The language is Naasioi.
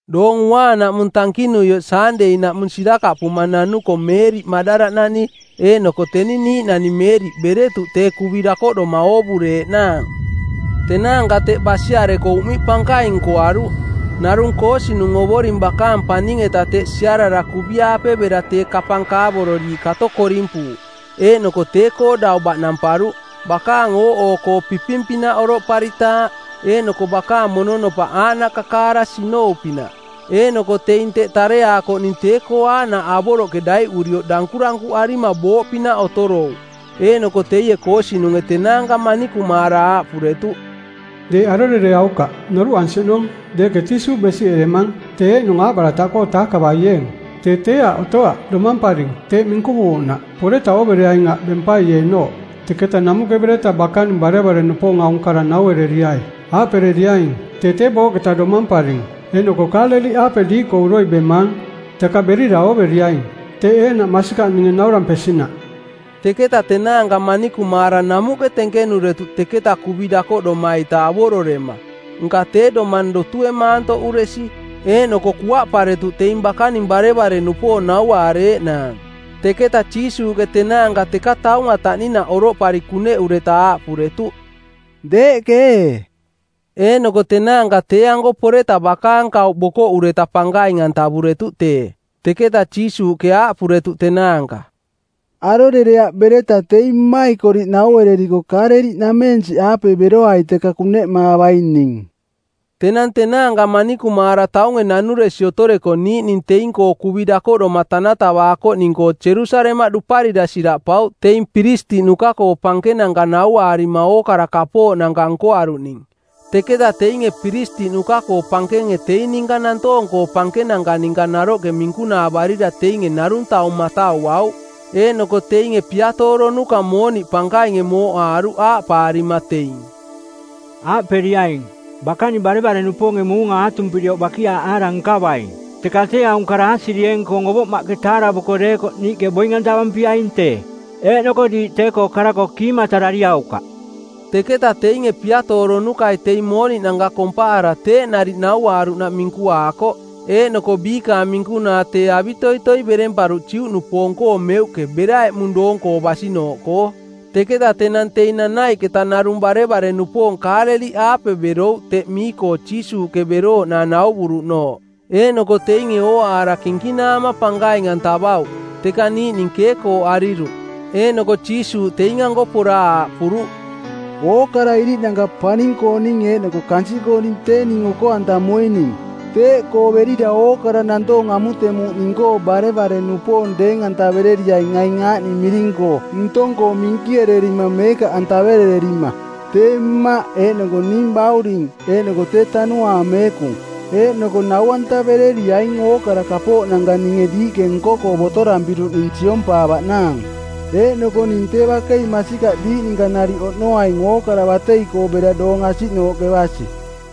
Doong Uaanaꞌmung tankinuioꞌ Saandei-naꞌmung sirakaꞌpuma nanuko Meeriꞌ Maꞌdala-nani eeꞌnoko teni niiꞌnani Meeriꞌ beretuꞌ tee kuvi dakoꞌdoma oovureeꞌnaang. Tenaanka teꞌ basiareko uꞌmiꞌ pankaing nkoaruꞌ. Narung koosinung˜ Ovoring bakaang paning-eta teꞌ siarara kuvi-aape bera tee kapang kaavororiiꞌ kato korimpuuꞌ eeꞌnoko tee-koo dau baꞌnamparuꞌ. Bakaang ooꞌoo-koo piping-pinaꞌ oroꞌparitaaꞌ, eeꞌnoko bakaang mononopaꞌ aaꞌnaꞌ kakaara sinou-pinaꞌ. Eeꞌnoko teing teꞌ tareaakoꞌning tee-koo aaꞌnaꞌ avoroꞌke daiꞌurioꞌ dankurankuꞌarima booꞌpinaꞌ otorouꞌ. Eeꞌnoko teie koosinunge tenaanka manikumaara aaꞌpuretuꞌ, “Deeꞌ arorereaukaꞌ. Noruꞌansi oꞌnong deeꞌke Jiisuuꞌ besiꞌeremang, tee eeꞌnung aaꞌbarataꞌkoo taakavaieeng. Tee tee aꞌ otoaꞌ, domamparing teeꞌ minkuvuuꞌnaꞌ. Poreta oovereaing aꞌ bempaieenooꞌ. Teketa namuꞌke bereta bakaning barevare-nupoong aung kara nauereriai, aaꞌpereriaing, ‘Tee tee booꞌketa domamparing, eeꞌnoko Kaaleliꞌaape diiꞌkoo uroi bemaang. Teka berira ooveriaing.’ Teeꞌ eeꞌnaꞌ masikaꞌ ninge naurampesinaꞌ.” Teketa tenaanka manikumaara namuꞌke tenkenuretuꞌ teketa kuvi dakoꞌdoma-ita avororema, nka tee domang dotue maantoꞌuresi. Eeꞌnoko kuaꞌparetuꞌ teing bakaning barevare-nupoong nauaareeꞌnaang. Teketa Jiisuuꞌke tenaanka teka taunga taꞌninaꞌ oroꞌpari kuneꞌureta aaꞌpuretuꞌ, “Deeꞌke ee!” Eeꞌnoko tenaanka tee-anko poreta bakaang kauꞌ bokoꞌureta pankaing-antavuretuꞌ tee. Teketa Jiisuuꞌke aaꞌpuretuꞌ tenaanka, “Arorereaꞌ bereta teing mmaikoriꞌ nauereriko Kaaleliꞌnameensiꞌaape beroai teka kuneꞌmaavaing ning.” Tenang tenaanka manikumaara taunge nanuresi otoreko niiꞌning teing-koo kuvi dakoꞌdoma tanatavaakoꞌning-koo Jerusalemaꞌ duparira siraꞌpauꞌ teing piristiꞌnuka-koo pankenanka nauaarima ookara kapooꞌnanka nkoaruꞌning. Teketa teinge piristiꞌnuka-koo pankenge teing ninka nantoong-koo pankenanka ninka naroꞌke minkunaavarira teinge narung taung matauauꞌ. Eeꞌnoko teing piatooronuka mooniꞌ pankainge mooꞌaaruꞌ aaꞌpaarima teing, “Aaꞌperiaing, ‘Bakaning barevare-nupoonge muunga aatumpirioꞌ bakiaaꞌaara nkavaing.’ Teka tee aung kara aasirieeng-koong ovoꞌmaꞌke taaravuko deekoꞌ niiꞌke boing-antavampiaing tee, eeꞌnoko diiꞌ tee-koo kara-koo kiimatarariaukaꞌ.” Teketa teinge piatooronukai teing mooniꞌnanka kompaara teeꞌ nariꞌ nauaaruꞌnaꞌ minkuakoꞌ. Eeꞌnoko biikaang minkunaa tee avitoitoi beremparuꞌ Juꞌnupoong-koo meuꞌke bera eꞌmung doong-koo basinooꞌkoo. Teketa tenang teing nanaiꞌketa narung barevare-nupoong Kaaleliꞌaape berouꞌ teꞌ mii-koo Jiisuuꞌke berooꞌnaang nauvuruꞌnooꞌ. Eeꞌnoko teinge ooaara kinkinaama pankaing-antavauꞌ, teka niiꞌning keekooꞌariruꞌ. Eeꞌnoko Jiisuuꞌ teing-anko pora aaꞌpuruꞌ, “Ookara iriꞌnanka paning-kooning eeꞌnoko kansiꞌkooning tee ning oko-antamuining. Teeꞌkoo berira ookara nantoong amutemuuꞌ ning-koo barevare-nupoong deeng-antavereriaing aing aaꞌning miring-koo ntong-koo minkiererima meekaꞌantaverererima: tee Mmaꞌ eeꞌnoko ning Bauring eeꞌnoko tee Tanuaang Meekung. Eeꞌnoko nau-antavereriaing ookara kapooꞌnanka ninge diiꞌke nko-koo botorampiruꞌning siompaavaꞌnaang, eeꞌnoko ning tee bakei masikaꞌ diiꞌ ninka nariꞌ oꞌnoaing ookara batei-koo bera doong asiꞌnooꞌke basi.”